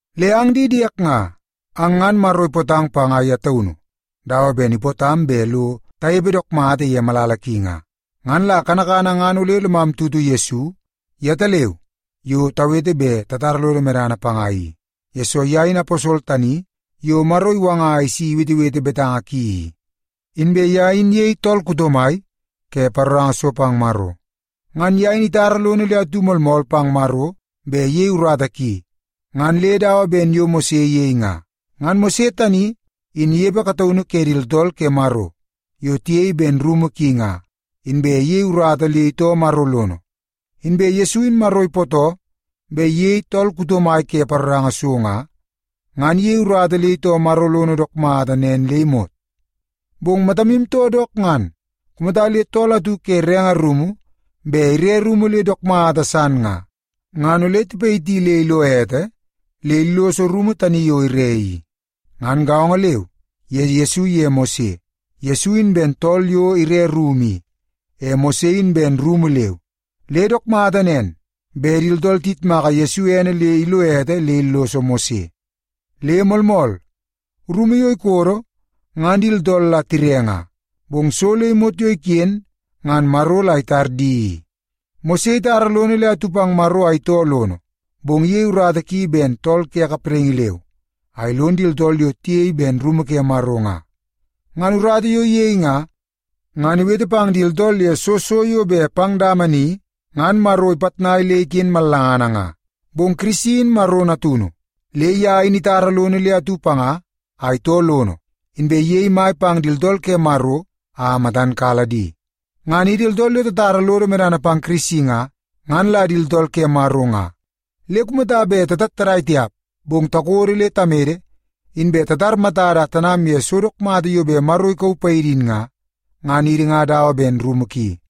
Le ang di diek nga, ang ngan Maro ipootang panga ye taunu dawa ben ipootam bet lo tanepe dook mata ye malala ki nga. Ngan la kanakana ngan ole lomu tutu Yesu yetaleu yo tawete bet tatara lodo medana panga i, yesoo ye in aposol tani yo Maro iwanga a isi iwetewete betanga ki i, inbe ye in iyei tool kuto mai ke paroranga so pang Maro. Ngan ye in itara lono le atu moolmool pang Maro bet iyei urata ki ngan le dawa ben yo Mose iyei nga. Ngan Mose tani inepe kataunu ke di tooltool ke Maro yo tiyei ben rumu ki nga, inbe iyei urata le itoo Maro lono. Inbe Yesu in Maro ipootoo bet iyei tool kuto mai ke paroranga so nga, ngan iyei urata le itoo Maro lono dook mata nen le imot. Bong matamu too dook ngan, kumata le tool atu ke renge rumu bet ire rumu le dook mata san nga, ngan ole tipayiti le ilo ete le illoso rumu tani yo ire i. Ngan gaongo leu ye Yesu iye Mose, Yesu in ben tool yo ire rumu i, e Mose in ben rumu leu, le dook mata nen bet di tooltool tiyitmaka Yesu ene le ilo ete le illoso Mose. Le moolmool, rumu yo ikodo ngan di tooltool la tire nga, bong so le imot yo iken ngan Maro la itar di i. Mose itara lono le atu pang Maro a itoo lono, bong iyei urata ki ben tool ke kapraingi leu, a ilon di tooltool yo tiyei ben rumu ke Maro nga. Ngan urata yo iyei nga, ngan iwete pang di tooltool ye soo so yo bet pang dama ni ngan Maro ipitnai le iken mallanga nga. Bong Kirisi in Maro Natunu, le ye in itara lono le atu panga a itoo lono, inbe iyei mai pang di tooltool ke Maro a matan kala di. Ngan idi tooltool yo tatara lodo medana pang Kirisi nga, ngan la di tooltool ke Maro nga. Le kumata bet tatattadai tiap, bong takodo le tamede, inbe tatar matada a tanam ye so dook mata yo bet Maro ikauu paidi in nga, ngan idi nga dawa ben rumu ki.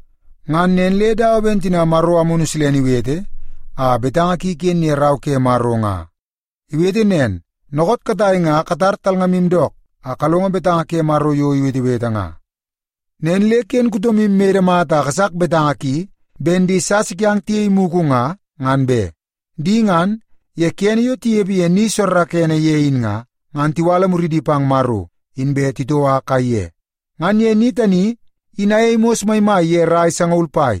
Ngan nen le dawa ben tina Maro Amunu Silene iwete a betanga ki iken ye Rau ke Maro nga. Iwete nen, “Dookoot katai nga katar talngamu dook, a kalongo betanga ke Maro yo iwetewete nga. Nen le ken kutomu imede mata a kasak betanga ki ben di sasa kiang tiyei mugu nga, ngan be. Di ngan, ye kene yo tinepe ye ni soorookoonoo ye in nga, ngan tiwala muridi pang Maro inbe titoua kaiye. Ngan ye ni tani in ayei mos maimai ye rai sangaul pai,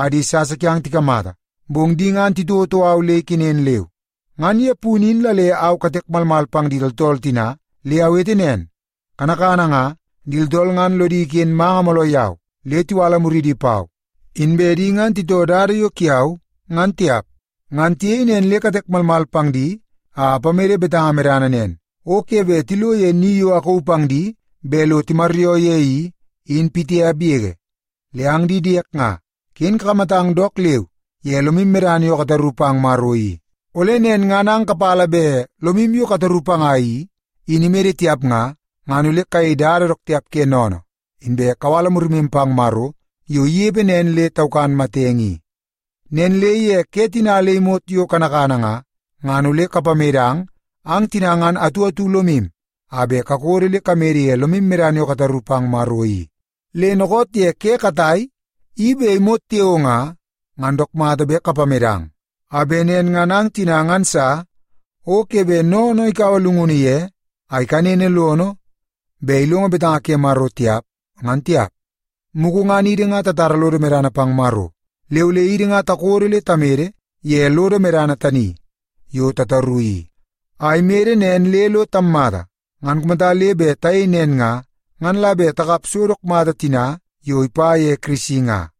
a di sasa kiang tikamata, bong di ngan titouotou au le ikenen leu. Ngan ye punu in la le au katek malmal pang di tooltool tina, le awete nen, ‘Kanakana nga, di tooltool ngan lodi iken manga mooloo yau, le tiwala muridi pau, inbe di ngan titoo dada yo kiau ngan tiap.’ Ngan tiyei nen le katek malmal pang di a apamede betanga medana nen, ‘O ke bet tilo ye ni yo akauu pang di bet lo timaryoo ye i, in pitiap yege.’” Le ang di diek nga, ken kakamatang dook leu ye lomu medana yo kataru pang Maro i. Ole nen ngan ang kapala bet lomu yo kataru panga i, in imede tiap nga, ngan ole kayei dada dook tiap ke sennene, inbe kawala murimu pang Maro yo inepe nen le taukan matenge i. Nen le ye ke tina le imot yo kanakana nga, ngan ole kapamedang ang tina ngan atu atu lomu a bet kakodo le kamede ye lomu medana yo kataru pang Maro i. Le dookoot ye ke katai, i bet imot tiao nga, ngan dook mata bet kapamedang, a bet nen ngan ang tina ngan sa o ke bet sennene ikaua llungunu ye a ikanene lono bet ilongo betanga ke Maro tiap, ngan tiap. Mugu ngan idi nga tatara lodo medana pang Maro, le ole idi nga takodo le tamede ye lodo medana tani yo tataru i, a imede nen le lo tammata. Ngan kumata le bet tayei nen nga, ngan la bet takap so dook mata tina yo ipa ye Kirisi nga.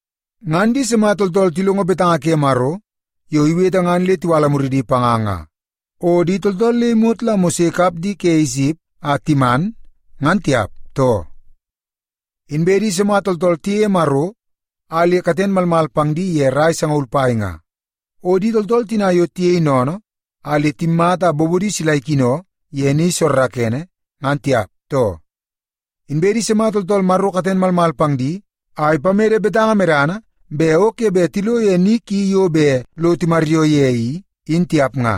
Ngan di sima tooltool tilongo betanga ke Maro yo iwete ngan le tiwala muridi panga nga? O di tooltool le imot la Mose ikap di ke Isip a timan ngan tiap, too? Inbe di sima tooltool tiyeie Maro a le katen malmal pang di ye rai sangaul pai nga? O di tooltool tina yo tiyei sennene, a le timmata a bobodi sila ikino ye ni soorookoonoo ngan tiap, too? Inbe di sima tooltool Maro katen malmal pang di, a ipamede betanga medana bet o ke bet tilo ye ni ki yo bet lo timaryoo ye i, in tiap nga?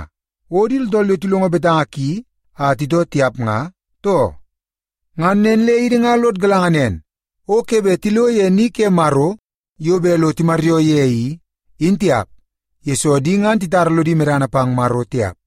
O di tooltool yo tilongo betanga ki a titoo tiap nga, too? Ngan nen le idi nga lod galanga nen, o ke bet tilo ye ni ke Maro yo bet lo timaryoo ye i, in tiap, yesoo di ngan titara lodi medana pang Maro tiap.